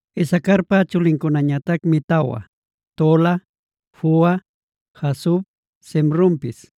Isacarpa chulincunañatacmi tawa: Tola, Fua, Jasub, Simronpis.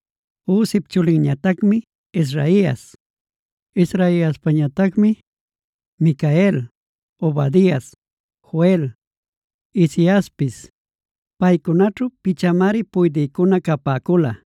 Uzip chulinñatacmi Israhias. Israhiaspañatacmi: Micael, Obadias, Joel, Isiaspis. Paycunaćhu pichanmari puydïcuna capäcula.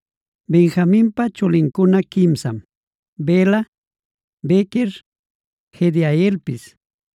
Benjaminpa chulincuna quimsam: Bela, Bequer, Jediaelpis.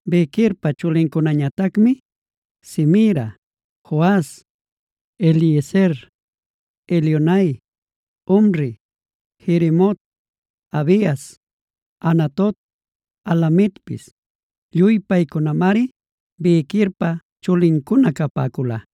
Bequerpa chulincunañatacmi: Zemira, Joas, Eliezer, Elioenai, Omri, Jerimot, Abias, Anatot, Alametpis. Lluy paycunamari Bequerpa chulincuna capäcula.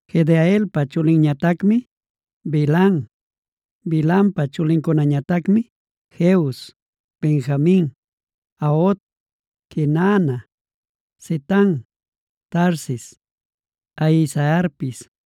Jediaelpa chulinñatacmi Bilhan. Bilhanpa chulincunañatacmi: Jeus, Benjamin, Aod, Quenaana, Zetan, Tarsis, Ahisaharpis.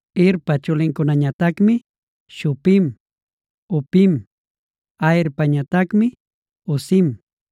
Hirpa chulincunañatacmi: Shupim, Hupim; Aherpañatacmi Husim.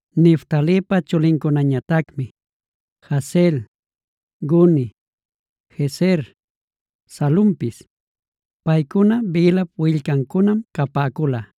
Neftalipa chulincunañatacmi: Jahzeel, Guni, Jezer, Salumpis. Paycuna Bilhap willcancunam capäcula.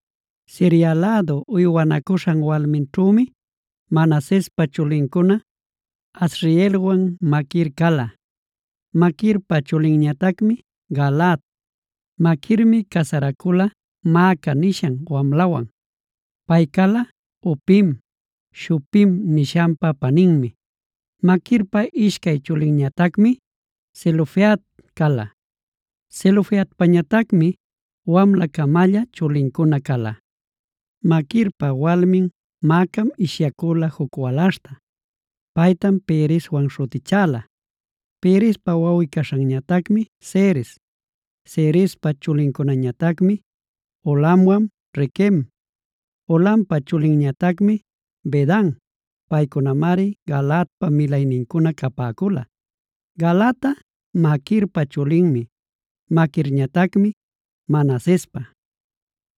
Siria lädu uywanacuśhan walminćhümi Manasespa chulincuna Asrielwan Maquir cala. Maquirpa chulinñatacmi Galaad. Maquirmi casaracüla Maaca nishan wamlawan. Pay cala Hupim, Shupim nishanpa paninmi. Maquirpa ishcay chulinñatacmi Zelofehad cala. Zelofehadpañatacmi wamla-camalla chulincuna cala. Maquirpa walmin Maacam ishyacüla juc walaśhta. Paytam Pereswan śhutichäla. Perespa wawꞌi-caśhanñatacmi Seres. Serespa chulincunañatacmi Ulamwan Requem. Ulampa chulinñatacmi Bedan. Paycunamari Galaadpa milaynincuna capäcula. Galaadꞌa Maquirpa chulinmi, Maquirñatacmi Manasespa.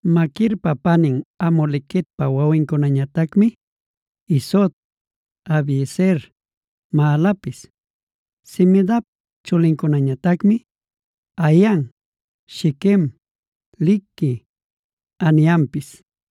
Maquirpa panin Hamolequetpa wawincunañatacmi: Isod, Abiezer, Mahalapis. Semidap chulincunañatacmi: Ahian, Shiquem, Likhi, Aniampis.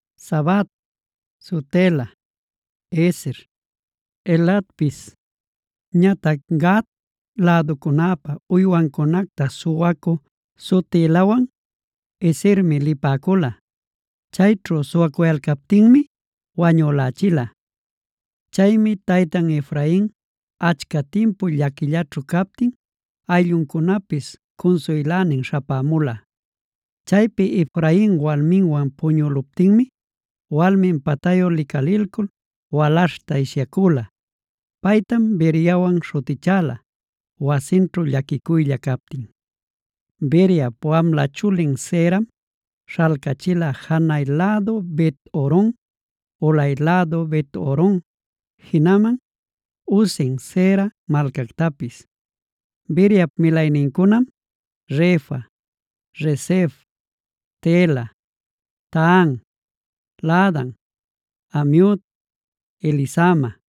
Zabad, Sutela, Ezer, Eladpis. Ñatac Gat läducunäpa uywancunacta suwacü Sutelawan Ezermi lipäcula; chayćhu suwayalcaptinmi wañülächila. Chaymi taytan Efrain achca timpu llaquicuyćhu captin aylluncunapis cunsuylänin śhapämula. Chaypi Efrain walminwan puñüluptinmi walmin patayu licalilcul walaśhta ishyacüla. Paytam Beriawana śhutichäla wasinćhu llaquicuylla captin. Beriap wamla chulin Seeram śhalcachila: janay-lädu Bet-horon, ulay-lädu Bet-horon, jinaman Uzen-seera malcactapis. Beriap milaynincunam: Refa, Resef, Telah, Tahan, Laadan, Amiud, Elisama,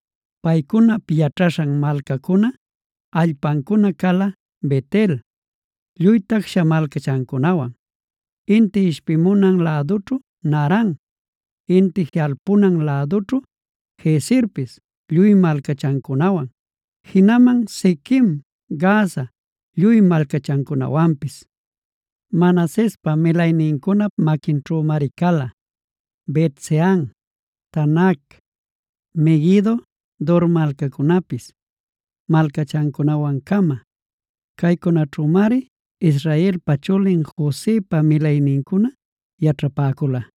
Paycunap yaćhaśhan malcancuna, allpancuna cala: Bet-el lluy tacsha malcachancunawan, inti ishpimunan lädućhu Naaran, inti jiꞌalpunan lädućhu Gezerpis lluy malcachancunawan, jinaman Shiquem, Gaza lluy malcachancunawanpis. Manasespa milaynincunap maquinćhümari cala: Bet-sean, Taanac, Meguido, Dor malcacunapis malcachancunawan-cama. Caycunaćhümari Israelpa chulin Josepa milaynincuna yaćhapäcula.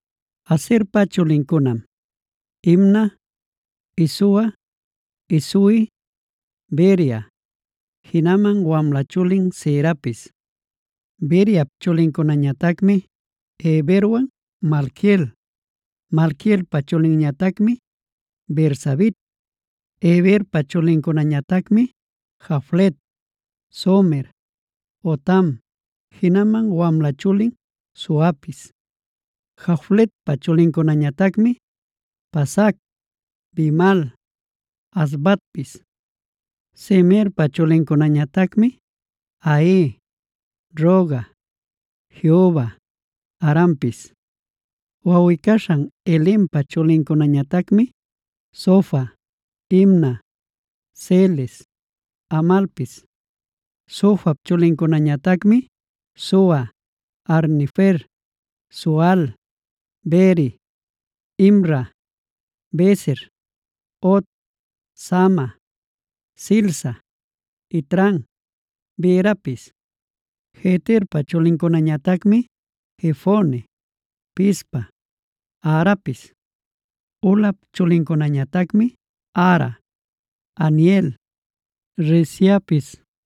Aserpa chulincunam: Imna, Isua, Isui, Beria, jinaman wamla chulin Serapis. Beriap chulincunañatacmi Heberwan Malquiel. Malquielpa chulinñatacmi Birzavit. Heberpa chulincunañatacmi: Jaflet, Somer, Hotam, jinaman wamla chulin Suapis. Jafletpa chulincunañatacmi: Pasac, Bimhal, Asvatpis. Semerpa chulincunañatacmi Ahi, Rohga, Jehuba, Arampis. Wawꞌi-caśhan Helempa chulincunañatacmi: Zofa, Imna, Seles, Amalpis. Zofap chulincunañatacmi: Sua, Harnefer, Sual, Beri, Imra, Beser, Hod, Sama, Silsa, Itran, Beerapis. Jeterpa chulincunañatacmi: Jefone, Pispa, Arapis. Ulap chulincunañatacmi: Ara, Haniel, Reziapis.